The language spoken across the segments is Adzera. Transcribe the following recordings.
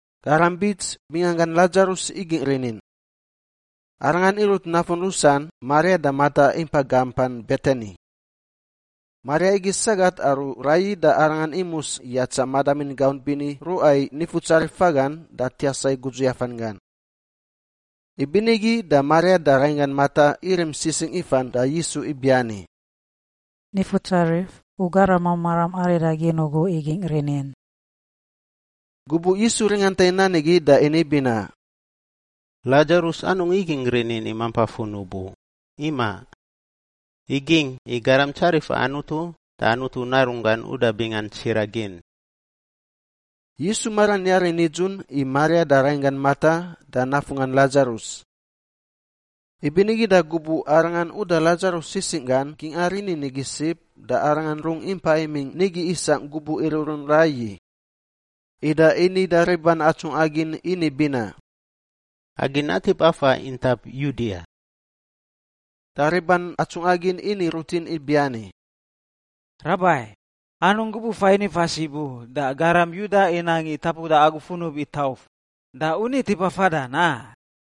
Garam bits binganggan Ladzarus igingꞌ rinin. Arangan irut nafun rusan Maria da Mata impa gampan Betani. (Maria igi sagat aru raiyi da arangan imus yatsa madamin gaunt bini ruꞌa i Nifutsarif fagan da tiasa i gudzu yafanggan.) Ibinigi da Maria da rainggan Mata irim sisingꞌ ifan da Yisu ibiani, “Nifutsarif, u garamam maram aridagin ugu igingꞌ rinin.” Gubuꞌ Yisu ringanta i nan igi da ini binaꞌ, “Ladzarus anungꞌ igingꞌ rinin i mampa funub u, imaꞌ! Igingꞌ i garam tsarifa Anutu da Anutu Narunggan uda bingan tsiraꞌ gin.” Yisu maran yari nidzun i Maria da rainggan Mata da nafunggan Ladzarus. Ibinigi da gubuꞌ Arangan uda Ladzarus sisingꞌ gan gingꞌa rinin igi sib da Arangan rungꞌ impa imingꞌ nigi isangꞌ gubuꞌ iruꞌrun raiyi. Ida ini da riban atsungꞌa gin ini binaꞌ, “Agi natip afa intap Yudia.” Da riban atsungꞌa gin ini rutin ibiani, “Rabai! Anungꞌ gubuꞌ fain ifa sib u, da garam Yuda inang i tapuda agu funub i tauf, da u ni tipa fadan, a?”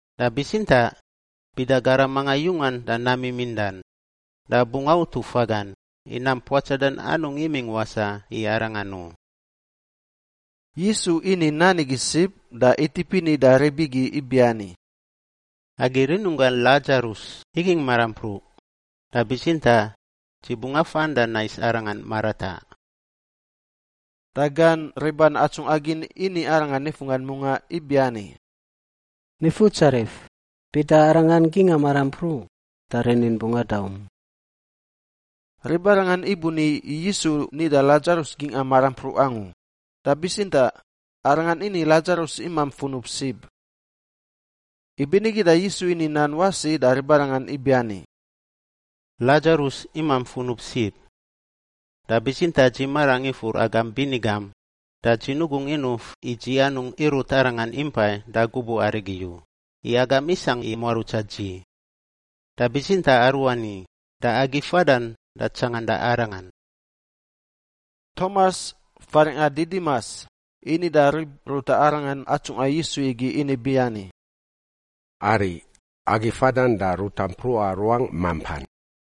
Da bitsintaꞌ bida garam mangan yungan da nam mimindan da bungꞌ autu fagan, i nam puatsadan anungꞌ imingꞌ wasaꞌ i arangan u.” Yisu ini nan igi sib da itip ini da rib igi ibiani, “Agi rinunggangꞌ Ladzarus igingꞌ marampruꞌ, da bitsintaꞌ dzi bungꞌ afan da nais arangan marataꞌ.” Da gan riban atsungꞌa gin ini arangan nifunggan mungaꞌ ibiani, “Nifutsarif, bida arangan gingꞌa marampruꞌ da rinin bungꞌ adaum.” Ribarangan ibuni Yisu nida Ladzarus gingꞌa marampruꞌ angu, da bitsintaꞌ Arangan ini i Ladzarus imamp funub sib. Ibinigi da Yisu ini nan wasi da ribarangan ibiani, “Ladzarus imamp funub sib. Da bitsintaꞌ dzi marangꞌ ifur agam bini gam da dzi nugungꞌ inuf i dzi anungꞌ irut arangan impai da gubuꞌ arigi u, i agam isangꞌ i muarutsa dzi. Da bitsintaꞌ aruani, da agi fadan da tsanganda arangan.” Tomas (faringꞌa Didimas) ini da rib ruta arangan atsungꞌa Yisu igi ini ibiani, “Ariꞌ! Agi fadan da ruta mpruꞌa ruangꞌ mampan.”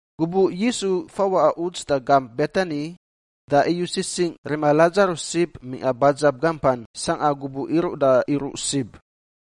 Gubuꞌ Yisu fawaꞌa uts da gamp Betani da iyu sisingꞌ rima Ladzarus sib mingꞌa badzab gampan sangꞌa gubuꞌ iruꞌ da iruꞌ sib.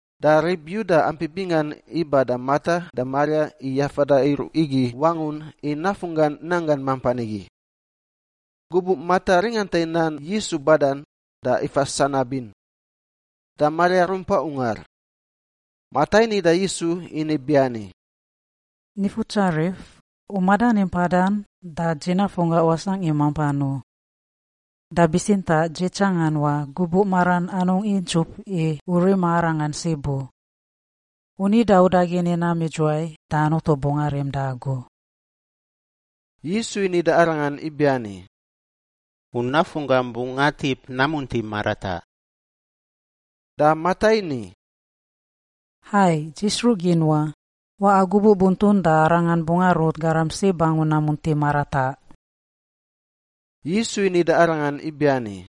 da rib Yuda ampi bingan iba da Mata da Maria i yafada iruꞌ igi wangun i nafunggan nanggan mampan igi. Gubuꞌ Mata ringanta i nan Yisu badan da ifa sanabin. Da Maria rumpa ungar. Mata ini da Yisu ini biani, “Nifutsarif, u madani mpadan da dzi nafunggangꞌ wasangꞌ i mampan u. Da bitsintaꞌ dzi tsangan wa, gubuꞌ maran anungꞌ intsup i u rima arangan sib u! U nida udagin i nam idzuwai da Anutu bungꞌ arim da agu.” Yisu ini da arangan ibiani, “U nafunggam bungꞌ atip namunti marataꞌ.” Da Mata ini, “Hai, dzi sruꞌ gin wa. Waꞌa gubuꞌ buntun da arangan bungꞌ arut garam sib angu namunti marataꞌ.” Yisu ini da arangan ibiani,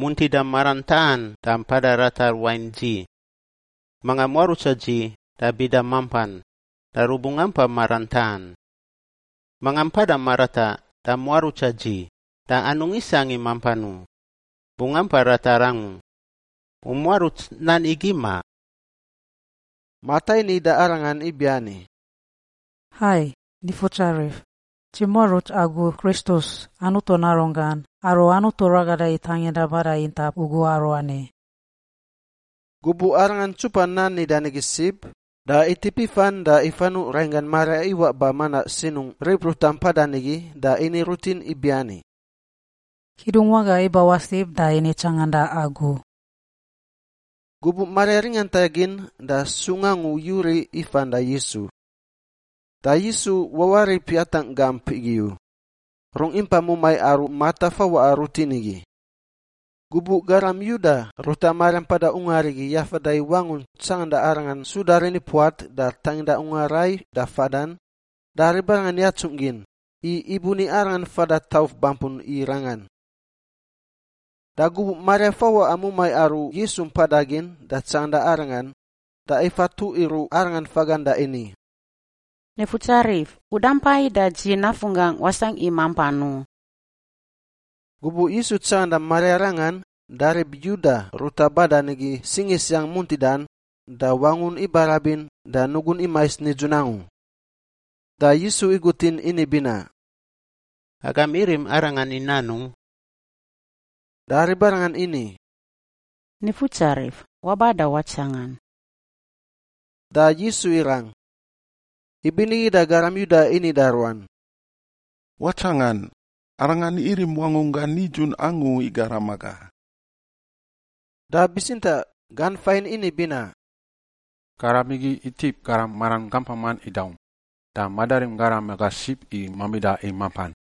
“Muntida maran taꞌan da mpada ratar wain dzi. Manga muarutsa dzi da bida mampan, da rubungꞌ ampa maran taꞌan. Manga mpada marataꞌ da muarutsa dzi da anungꞌ isangꞌ i mampan u, bungꞌ ampa ratar angu. U muaruts nan igi, ma?” Mata ini da Arangan ibiani, “Hai, Nifutsarif! Dzi muaruts Agu Kristus, Anutu Narunggan, aru Anutu ragada i tanginda bada intap ugu aruani.” Gubuꞌ arangan ntsupa nan nidan igi sib, da itip ifan da ifanuꞌ rainggan Maria iwaꞌ ba manaꞌ sinungꞌ rib ruta mpadan igi da ini rutin ibiani, “Kidungwaga ibawaꞌ sib da ini tsanganda agu.” Gubuꞌ Maria ringanta gin da sungꞌ angu yuriꞌ ifan da Yisu. Da Yisu wawarip yatangꞌ gamp igi u; rungꞌ impa mumai aru Mata fawaꞌa rutin igi. Gubuꞌ garam Yuda ruta Maria mpada ungar igi i yafada i wangun tsanganda arangan suda rinipuat da tanginda ungar rai da fadan, da ribarangan yatsungꞌ gin, i ibuni arangan fada tauf bampun i rangan. Da gubuꞌ Maria fawaꞌa mumai aru Yisu mpada gin da tsanganda Arangan, da ifa tuꞌ iruꞌ Arangan fagan da ini, “Nifutsarif, U dampai da dzi nafunggangꞌ wasangꞌ i mampan u.” Gubuꞌ Yisu tsanganda Maria rangan da rib Yuda ruta badan igi singisiang muntidan da wangun ibarabin da nugun imais nidzun angu. Da Yisu igutin ini binaꞌ, “Agam irim arangan i nanungꞌ?” Da ribarangan ini, “Nifutsarif, waba da watsangan.” Da Yisu irang. Ibinigi da garam Yuda ini da ruan, “Watsangan! Arangan irim wangunggan nidzun angu i garam aga.” Da bitsintaꞌ gan fain ini binaꞌ, “Garam igi itip garam maran gampaman idaum, da madarim garam aga sib i mamida i mampan.”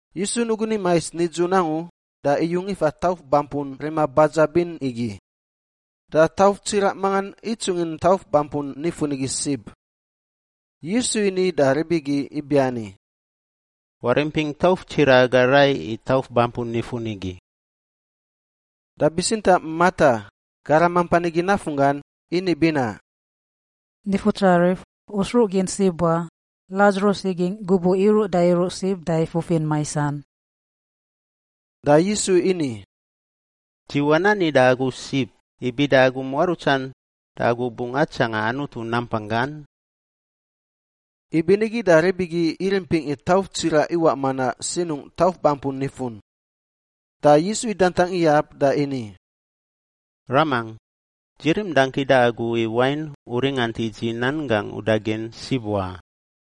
Yisu nugun imais nidzun angu da iyung ifa tauf bampun rima badzab in igi. Da tauf tsiraꞌ mangan itsungin tauf bampun nifun igi sib. Yisu ini da rib igi ibiani, “Warimpingꞌ tauf tsiraꞌ aga rai i tauf bampun nifun igi.” Da bitsintaꞌ Mata, garam mampan igi nafunggan, ini binaꞌ, “Nifutsarif, U sruꞌ gin sib wa, Ladzarus igingꞌ gubuꞌ iruꞌ da iruꞌ sib da ifufin maisan.” Da Yisu ini, “Dzi wanani da agu sib i bida u muarutsan, da agu bungꞌ atsangan Anutu nampanggan?” Ibinigi da rib igi irimpingꞌ i tauf tsiraꞌ iwaꞌ manaꞌ sinungꞌ tauf bampun nifun. Da Yisu idantang iyab da ini, “Ramangꞌ, dzi rim dangki da Agu i wain U ringant i dzi nan gangꞌ udagin sib wa.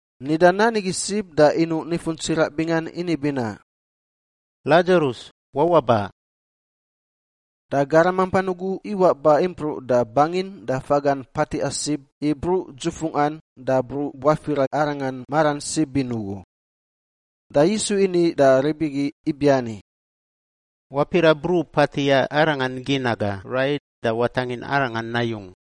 Nida nan igi sib da inuꞌ nifun tsiraꞌ bingan ini binaꞌ, “Ladzarus, wawaꞌ ba!” Da garam mampan ugu iwaꞌ ba impruꞌ da bangin da fagan patiꞌa sib i bruꞌ dzufungꞌan da bruꞌ buafira arangan maran sib in ugu. Da Yisu ini da rib igi ibiani, “Wapiraꞌ bruꞌ patiꞌa arangan gin aga rai da watangin arangan nayung.”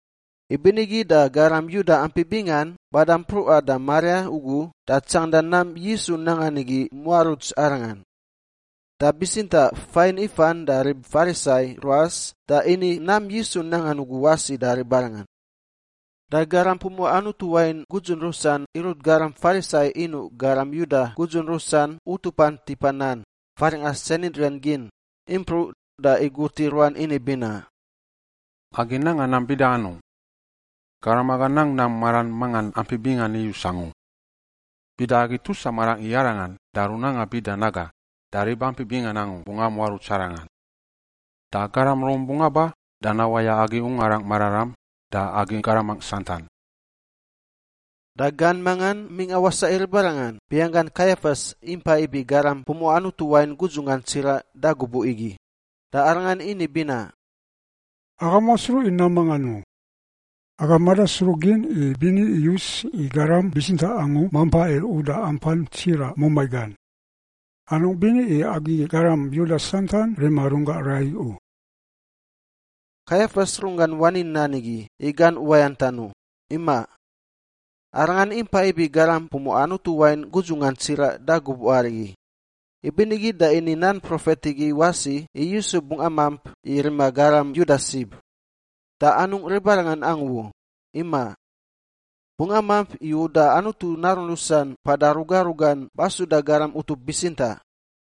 Ibinigi da garam Yuda ampi bingan bada mpruꞌa da Maria ugu da tsanganda nam Yisu nangan igi imuaruts Arangan. Da bitsintaꞌ fain ifan da rib Farisai ruas da ini nam Yisu nangan ugu wasi da ribarangan. Da garam pumuꞌa Anutu wain gudzun rusan irut garam Farisai inuꞌ garam Yuda gudzun rusan utupan tipa nan, faringꞌa Sanhidrin gin, impruꞌ da igut i ruan ini binaꞌ, “Agi nanga nam bida anungꞌ? Garam aga nang nam maran mangan ampi bingan iyus angu. Bida agi tusa marangꞌ i arangan da runanga bida naga da rib ampi bingan angu bungꞌ amuaruts arangan. Da garam Rom bungꞌ aba da nawaya agi Ungarangꞌ Mararam da agi garamangꞌ santan.” Da gan mangan mingꞌa wasaꞌ i ribarangan binganggan Kaiafas impa ibi garam pumuꞌa Anutu wain gudzunggan tsiraꞌ da gubuꞌ igi, da arangan ini binaꞌ, “Agam wasruꞌ i nam mangan u! Agam madasruꞌ gin i bini iyus i garam bitsintaꞌ angu mampa i uda ampan tsiraꞌ mumai gan; anungꞌ bini i agi garam Yuda santan rima runggangꞌ rai u.” Kaiafas runggan wani nan igi i gan uwayantan u, imaꞌ. Arangan impa ibi garam pumuꞌa Anutu wain gudzungan tsiraꞌ da gubuꞌ arigi, ibinigi da ini nan profet igi wasi i Yisu bungꞌ amamp i rima garam Yuda sib, da anungꞌ ribarangan angu u, imaꞌ. Bungꞌ amamp i uda Anutu narun rusan mpada ruga rugan basuda garam utup bitsintaꞌ.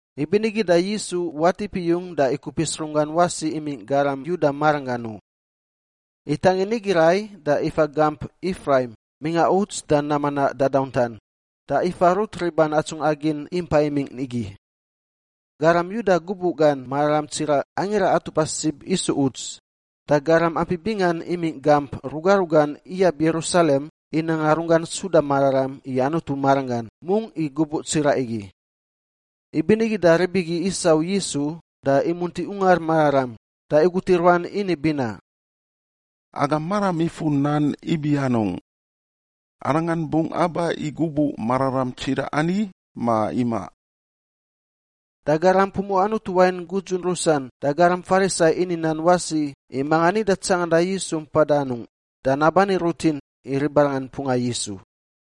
Ibinigi da Yisu watip iyung da ikupis runggan wasi imingꞌ garam Yuda maranggan u. Itangin nigi rai da ifa gamp Ifraim mingꞌa uts da nam manaꞌ dadauntan da ifa rut riban atsungꞌa gin impa imingꞌ igi. Garam Yuda gubuꞌ gan mararam tsiraꞌ Angira Atupa Sib isu uts, da garam ampi bingan imingꞌ gamp ruga rugan iyab Yerusalem i nanga runggan suda mararam i Anutu maranggan mungꞌ i gubuꞌ tsiraꞌ igi. Ibinigi da rib igi isau Yisu da imunti Ungar Mararam da igut i ruan ini binaꞌ, “Agam maram ifur nan ibi anungꞌ? Arangan bungꞌ aba i gubuꞌ mararam tsiraꞌ ani, ma imaꞌ?” Da garam pumuꞌa Anutu wain gudzun rusan da garam Farisai ini nan wasi i manga nida tsanganda Yisu mpada anungꞌ da nabani rutin i ribarangan mpunga Yisu.